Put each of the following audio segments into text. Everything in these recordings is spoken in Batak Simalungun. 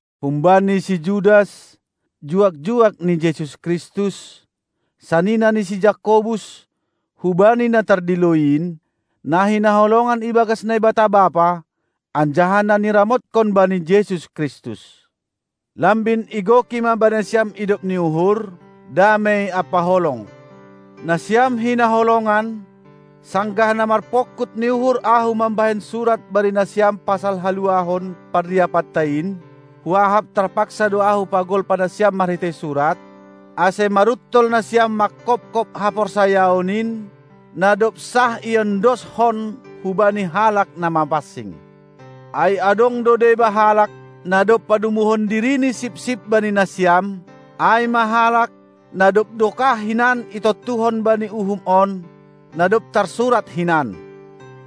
Humbani si Judas, juak-juak ni Jesus Kristus, sanina ni si Jakobus, hubani na tardilo in, na hinaholongan ibagas Naibata Bapa, anjaha na niramotkon bani Jesus Kristus. Lambin igoki ma bani nasiam idop ni uhur, damei ampa holong! Nasiam hinaholongan, sanggah na marpongkut ni uhur ahu mambahen surat bani nasiam pasal haluahon parriapanta in, huahap tarpaksa do ahu pagolpa nasiam marhitei surat, ase maruntol nasiam manghophop haporsayaon in, na dob sah iondoskon hubani halak na mapansing. Ai adong do deba halak, na dob padomuhon dirini sipsip bani nasiam, ai ma halak, na dob dokah hinan itontuhon bani uhum on, na dob tarsurat hinan: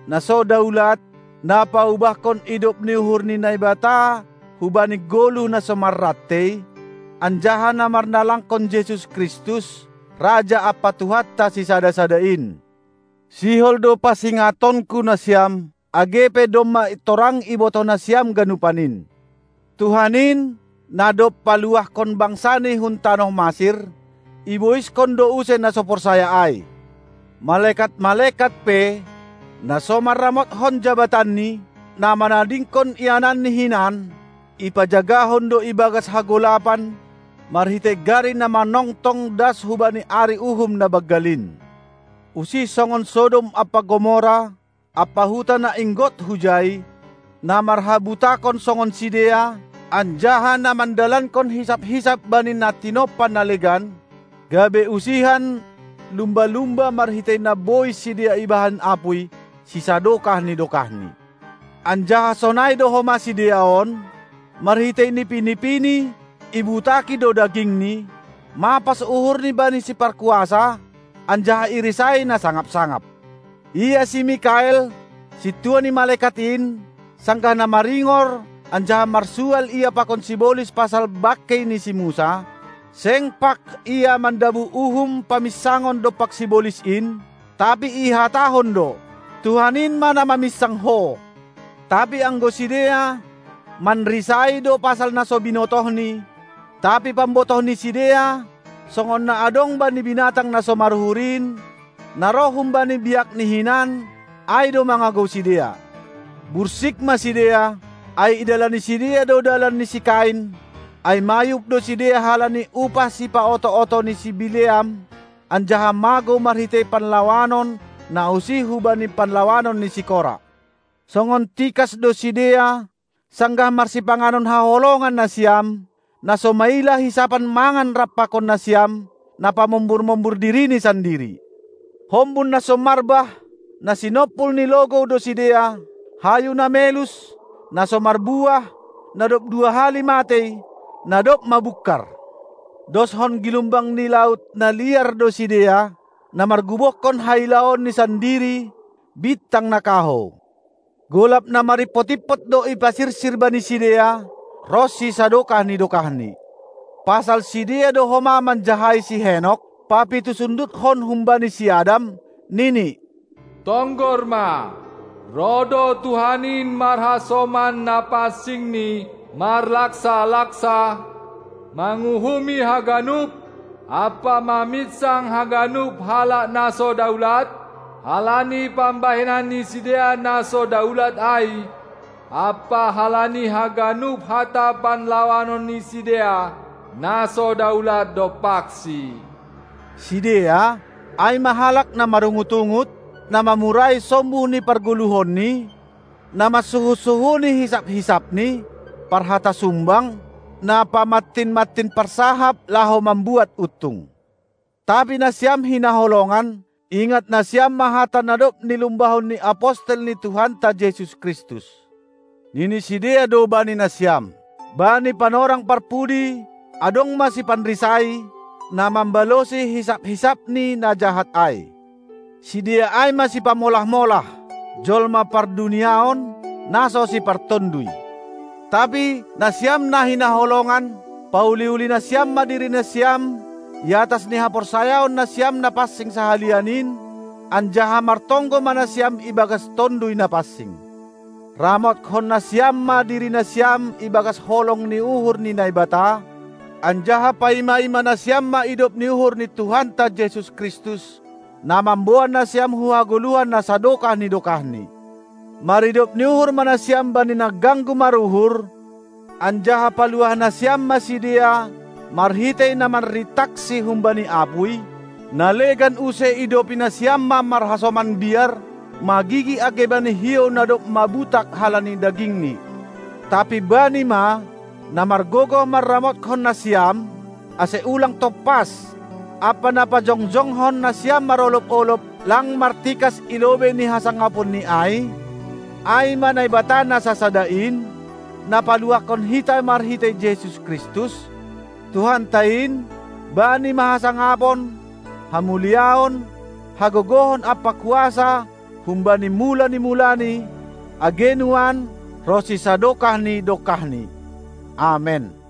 Na so daulat, na paubahkon idop ni uhur ni Naibata hubani goluh na so marrantei, anjaha na marnalangkon Jesus Kristus, Raja ampa Tuhanta sisada-sada in. Sihol do pasingatonku nasiam, age pe domma torang ibotoh nasiam ganupan in: Tuhan in, na dob paluahkon bangsaNi hun tanoh Masir, iboishon do use na so porsaya ai. Malekat-malekat pe, na so manramotkon jabatanni, na manadingkon iananni hinan, ipajagahon do ibagas hagolapan marhitei gari na manongtong das hubani ari uhum na banggal in. Usih songon Sodom ampa Gomora ampa huta na inggot hujai, na marhabutakon songon sidea, anjaha na mandalankon hisap-hisap bani na tinompa na legan, gabe usihan lumba-lumba marhitei na bois sidea ibahen apuy sisadokah ni dokahni. Anjaha sonai do homa sidea on, marhitei nipi-nipini ibutaki do dagingni, mapas uhurni bani siparkuasa anjaha irisai na sangap-sangap. Ia si Mikael, sintua ni malekat in, sanggah na maringor anjaha marsual ia pakon sibolis pasal bangkei ni si Musa, seng pag ia mandabuh uhum paminsangon dompak sibolis in, tapi ihatahon do: Tuhan in ma na maminsang ho. Tapi anggo sidea, manrisai do pasal na so binotohni; tapi pambotoh ni sidea, songon na adong bani binatang na so maruhur in, na roh humbani biakni hinan, ai do mangagou sidea. Bursik ma sidea, ai idalani sidea do dalan ni si Kain, ai mayub do sidea halani upah sipaoto-oto ni si Bileam, anjaha magou marhitei panlawanon na usih hubani panlawanon ni si Kora. Songon tikas do sidea sanggah marsipanganon haholongan nasiam, na so maila hisapan mangan rap pakon nasiam, na pamombur-mombur dirini sandiri; hombun na so marbah, na sinompul ni logou do sidea, hayu na melus, na so marbuah, na dob dua hali matei, na dob mabungkar; doshon gilumbang ni laut na liar do sidea, na margubohkon hailaonni sandiri, bintang na kahou; golap na marimpot-impot do ipasirsir bani sidea ronsi sadokah ni dokahni. Pasal sidea do homa manjahai si Henok, papitusundutkon humbani si Adam, nini: Tonggor ma, roh do Tuhan in marhasoman NapansingNi, marlaksa-laksa, manguhumi haganup ampa maminsang haganup halak na so daulat halani pambahenan ni sidea na so daulat ai ampa halani haganup hata panlawanon ni sidea na so daulat dompakSi. Sidea, ai ma halak na marungut-ungut, na mamurai sombuh ni pargoluhonni, na mansuhun-suhuni hisap-hisapni, parhata sumbang, na pamantin-mantin parsahap laho mambuat untung. Tapi nasiam, hinaholongan, ingat nasiam ma hata na dob nilumbahon ni apostel ni Tuhanta Jesus Kristus. Nini sidea do bani nasiam: Bani panorang parpudi adong ma sipanrisai, na mambalosi hisap-hisapni na jahat ai. Sidea ai ma sipamolah-molah, jolma pardunia on, na so sipartonduy. Tapi, nasiam na hinaholongan, pauli-uli nasiam ma diri nasiam i atas ni haporsayaon nasiam na pansing sahalian in, anjaha martonggo ma nasiam ibagas Tonduy Napansing. Ramothon nasiam ma diri nasiam ibagas holong ni uhur ni Naibata, anjaha paima-ima nasiam ma idop ni uhur ni Tuhanta Jesus Kristus, na mamboan nasiam hu hagoluhan na sadokah ni dokahni. Maridop ni uhur ma nasiam bani na ganggu maruhur, anjaha paluah nasiam ma sidea marhitei na manrintaksi humbani apuy; na legan use idopi nasiam ma marhasoman biar, magigi age bani hiou na dob mabutak halani dagingni. Tapi Bani ma, na margogoh manramothon nasiam, ase ulang tompas, ampa na pajongjongkon nasiam marolob-olob, lang martikas i lobei ni hasangaponNi ai, ai ma Naibata na sasada in, na paluahkon hita marhitei Jesus Kristus, Tuhanta in, Bani ma hasangapon, hamuliaon, hagogohon ampa kuasa humbani mula ni mulani, age nuan, ronsi sadokah ni dokahni. Amen.